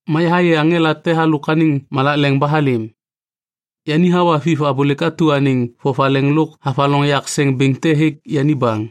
Ma yahayê aŋela te halôk anêŋ malak leŋ ba halêm. Yani hawa Viv abôlêk atu anêŋ vovaleŋ lôk havaloŋ yak seŋ bêŋ te hêk yani baŋ.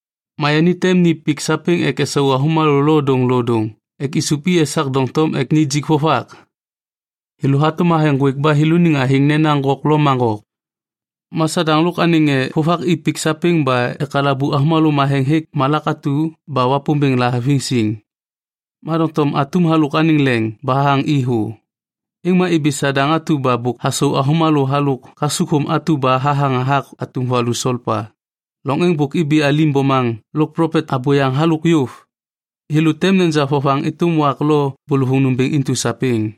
Ma yani tem ni pik sapêŋ ek esau avômalô lodôŋlodôŋ ek isup i esak doŋtom ek nijik vovak. Thêlô hatôm thathe ŋgwêk ba thêlôniŋ athêŋ nena Gok lo Magok. Ma Sadaŋ lôk anêŋ ŋê vovak i pik sapêŋ ba ekalabu avômalô matheŋ hêk malak atu ba Wapômbêŋ lahaviŋ siŋ. Ma doŋtom atum halôk anêŋ leŋ ba hathaŋ i thô. Êŋ ma ibi Sadaŋ atu ba bôk hasau avômalô halôk kasukthôm atu ba hathaŋ hathak atum valu solpa. Loŋ êŋ bôk ibi alim bomaŋ lôk plopet abôyaŋ halôk yôv. Thêlô tem neja vovaŋ êtôm wak lo bôlôvôŋ nômbêŋ intu sapêŋ.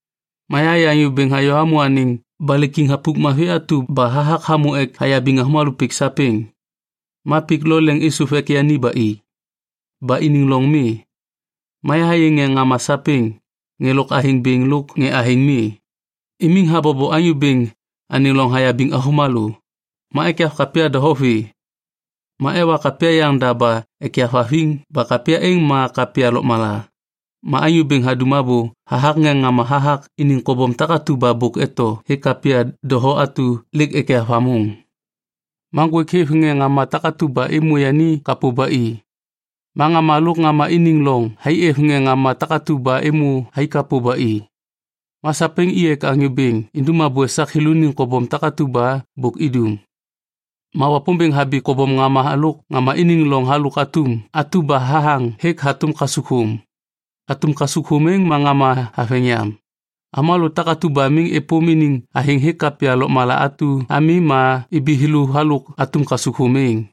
Ma yahayê Anyô Bêŋ hayô hamô anêŋ balê kiŋ thapuk mavi atu ba hathak hamô ek hayabiŋ avômalô pik sapêŋ. Ma pik lo leŋ êsôv ek yani ba i. Ba iniŋ loŋ mi. Ma yahayê ŋê ŋama sapêŋ, ŋê lôk athêŋ bêŋ lôk ŋê athêŋ mi, imiŋ habobo Anyô Bêŋ anêŋ loŋ hayabiŋ avômalô. Ma ekyav kapya doho vê. Ma ewa kapya yaŋda ba ekyav haviŋ ba kapya êŋ ma kapya lôkmala. Ma Anyô Bêŋ hadum abô hathak ŋê ŋama hathak iniŋ kobom takatu ba bôk eto hêk kapya doho atu lêk ekyav hamôŋ. Ma ŋgwêk hêv ŋê ŋama takatu ba êmô yani kapô ba i. Ma Ŋama lôk Ŋama iniŋ loŋ thai êv ŋê ŋama takatu ba êmô thai kapô ba i. Ma sapêŋ i ek Anyô Bêŋ indum abô esak thêlôniŋ kobom takatu ba bôk idum. Ma Wapômbêŋ habi kobom Ŋama lôk Ŋama iniŋ loŋ halôk atum atu ba hathaŋ hêk hatôm kasukthôm. Atum kasukthôm êŋ ma ŋama haveŋ yam. Avômalô takatu ba miŋ êpôm iniŋ athêŋ hêk kapya lôkmala atu ami ma ibi thêlô halôk atum kasukthôm êŋ.